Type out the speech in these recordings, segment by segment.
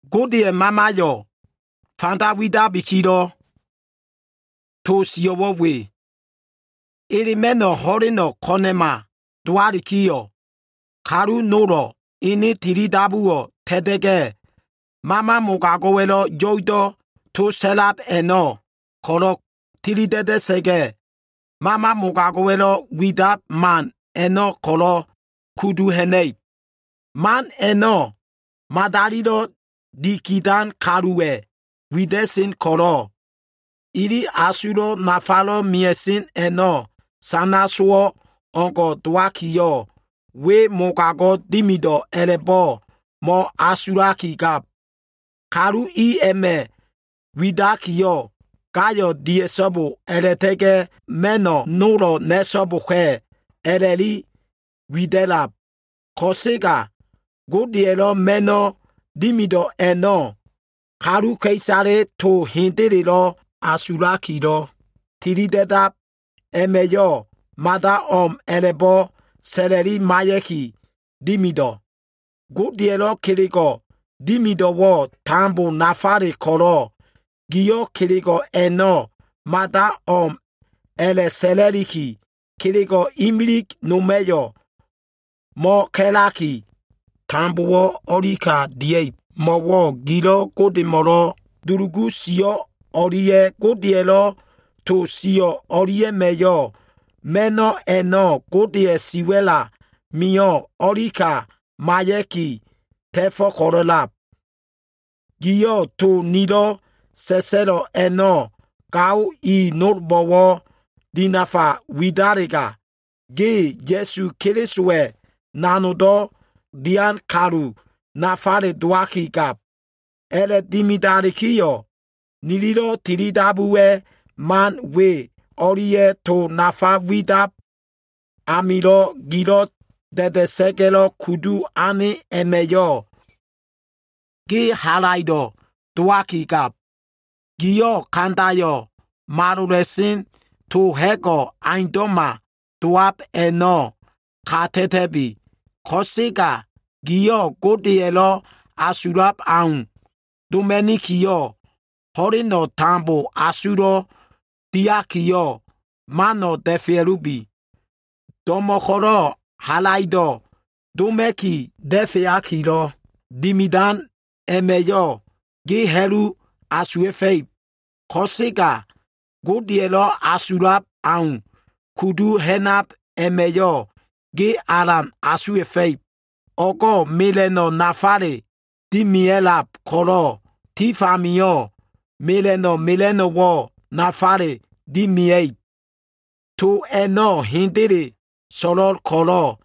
Godeya꞉ Mamaya꞉yo꞉ fanda widakilo꞉ to sio꞉wo꞉ we. Elema꞉no꞉ ho꞉leno꞉ ko꞉na꞉ma dowalikiyo꞉, kalu nolo꞉ ene tilidabuwo꞉ ta꞉ta꞉ga꞉, mama mogago꞉wa꞉lo꞉ yo꞉ido꞉ to sa꞉lab a꞉no꞉ ko꞉lo꞉ tilida꞉da꞉sa꞉ga꞉, mama mogago꞉wa꞉lo꞉ widab man a꞉no꞉ ko꞉lo꞉ kudu ha꞉na꞉ib. Man a꞉no꞉ madalilo꞉ dikidan kaluwa꞉ wida꞉sen ko꞉lo꞉, ili asulo꞉ nafalo꞉ mia꞉sen a꞉no꞉ sana sowo꞉ o꞉ngo꞉ dowakiyo꞉, we mogago꞉ dimido꞉ a꞉la꞉bo꞉ mo꞉asulakigab. Kalu i a꞉ma꞉ widakiyo꞉, gayo꞉ dia꞉so꞉bo a꞉la꞉ta꞉ga꞉ ma꞉no꞉ nolo꞉ na꞉so꞉boka꞉ a꞉la꞉liki wida꞉lab. Ko꞉sega Godeya꞉lo꞉ ma꞉no꞉ dimido꞉ a꞉no꞉, kaluka꞉isale to hendelelo꞉ asulakilo꞉ tilida꞉dab a꞉ma꞉yo꞉ mada o꞉m a꞉la꞉bo꞉ sa꞉la꞉li maiya꞉ki, dimido꞉. Godeya꞉lo꞉ kelego꞉ dimido꞉wo꞉ tambo nafale ko꞉lo꞉ gio꞉ kelego꞉ a꞉no꞉ mada o꞉m a꞉la꞉sa꞉la꞉liki, kelego꞉ imilig noma꞉yo꞉ mo꞉ka꞉laki, tambowo꞉ o꞉lika dia꞉ib. Mo꞉wo꞉ gililo꞉ Godemo꞉lo꞉ dulugu sio꞉ o꞉lia꞉ Godeya꞉lo꞉ to sio꞉ o꞉lia꞉ma꞉yo꞉ ma꞉no꞉ a꞉no꞉ Godeya꞉ siwa꞉l amio꞉ o꞉lika maiya꞉ki ta꞉fo꞉ ko꞉lo꞉lab. Giyo꞉ to nilo꞉ sa꞉sa꞉lo꞉ a꞉no꞉ gao i nolbo꞉wo꞉ dinafa widalega, ge Ya꞉su Kelisowa꞉ nanogdo꞉ dian kalu nafale dowakigab. A꞉la꞉dimidalikiyo꞉, nililo꞉ tilidabuwa꞉ man we o꞉lia꞉ to nafa widab amilo꞉ gilo꞉ da꞉da꞉sa꞉ga꞉lo꞉ kudu ane a꞉ma꞉yo꞉, ge halaido꞉ dowakigab. Giyo꞉ kandayo꞉ malola꞉sen, to ha꞉go꞉ aundo꞉ma dowab a꞉no꞉ kata꞉ta꞉bi. Ko꞉sega giyo꞉ Godeya꞉lo꞉ asulab au doma꞉nikiyo꞉, ho꞉leno꞉ tambo asulo꞉wo꞉ diakiyo꞉, mano꞉ da꞉fea꞉lubi. Do꞉mo꞉ ko꞉lo꞉ halaido꞉ doma꞉ki da꞉feakilo꞉ dimidan a꞉ma꞉yo꞉ ge ha꞉lu asuwa꞉fa꞉ib. Ko꞉sega, Godeya꞉lo꞉ asulab au kudu ha꞉nab a꞉ma꞉yo꞉, ge alan asuwa꞉fa꞉ib. O꞉go꞉ mela꞉no꞉ nafale dimia꞉lab ko꞉lo꞉, tif amio꞉ mela꞉no꞉ mela꞉no꞉wo꞉ nafale dimia꞉ib. To a꞉no꞉ hendele so꞉lo꞉l ko꞉lo꞉,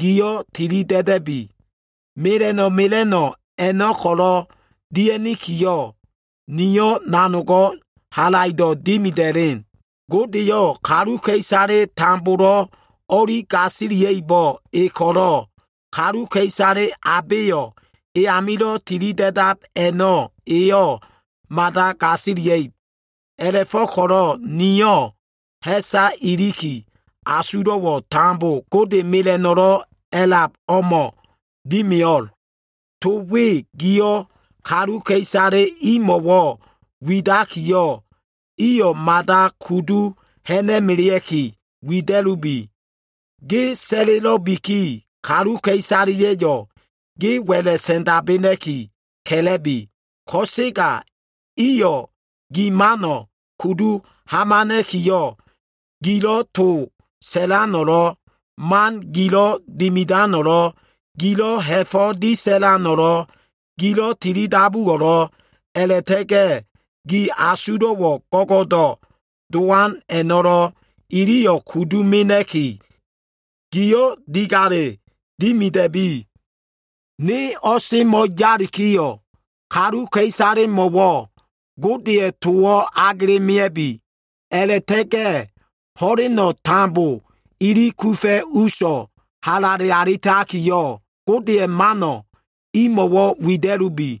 gio꞉ tilida꞉da꞉bi. Mela꞉no꞉ mela꞉no꞉ a꞉no꞉ ko꞉lo꞉ dia꞉nikiyo꞉, nio꞉ nanogo꞉ halaido꞉ dimida꞉len. Godeyo꞉ kaluka꞉isale tambolo꞉ o꞉li gasilia꞉ibo꞉ e ko꞉lo꞉ kaluka꞉isale abeyo꞉ e amilo꞉ tilida꞉dab a꞉no꞉ eyo꞉ mada gasilia꞉ib. A꞉la꞉fo꞉ko꞉lo꞉ nio꞉ ha꞉sa iliki, asulo꞉wo꞉ tambo Gode mela꞉no꞉lo꞉ a꞉lab emo꞉ dimia꞉lo꞉l. To we giyo꞉ kaluka꞉isale imo꞉wo꞉ widakiyo꞉, iyo꞉ mada kudu ha꞉na꞉melea꞉ki wida꞉lubi. Ge sa꞉lelo꞉biki, kaluka꞉isaleya꞉yo꞉ ge wa꞉la꞉ sa꞉ndabena꞉ki, ka꞉la꞉bi. Ko꞉sega iyo꞉ gi mano꞉ kudu hamana꞉kiyo꞉, gilo꞉ to sa꞉lano꞉lo꞉, man gilo꞉ dimidano꞉lo꞉, gilo꞉ ha꞉fo꞉ disa꞉lano꞉lo꞉, gilo꞉ tilidabuwo꞉lo꞉, a꞉la꞉ta꞉ga꞉ gi asulo꞉wo꞉ go꞉go꞉do꞉ dowan a꞉no꞉lo꞉, iliyo꞉ kudu mena꞉ki, giyo꞉ digale dimida꞉lubi. Ne o꞉semo꞉ yalikiyo꞉, kaluka꞉isalemo꞉wo꞉ Godeya꞉ towo꞉ agela꞉ mea꞉bi. A꞉la꞉ta꞉ga꞉ ho꞉leno꞉ tambo ili kufa꞉ uso꞉ halale alitakiyo꞉, Godeya꞉ mano꞉ imo꞉wo꞉ wida꞉lubi.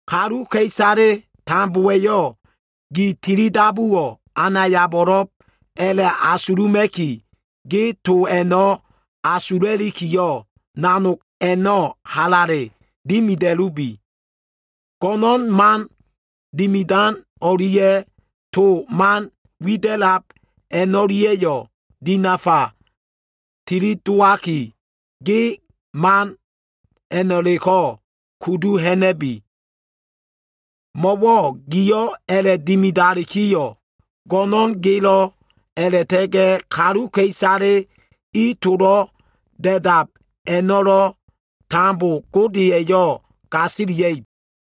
Kaluka꞉isale tambowa꞉yo꞉ gi tilidabuwo꞉ anayabo꞉lo꞉b a꞉la꞉asuluma꞉ki, ge to a꞉no꞉ asula꞉likiyo꞉, nanog a꞉no꞉ halale dimida꞉lubi. Go꞉no꞉n man dimidan o꞉lia꞉ to man wida꞉lab a꞉no꞉lia꞉yo꞉ dinafa tilidowaki, ge man a꞉no꞉leko꞉ kudu ha꞉na꞉lubi. Mo꞉wo꞉ giyo꞉ a꞉la꞉dimidalikiyo꞉, go꞉no꞉n gelo꞉ a꞉la꞉ta꞉ga꞉ kaluka꞉isale gi tolo꞉ da꞉dab a꞉no꞉lo꞉ tambo Gode eyo꞉ gasilia꞉ib.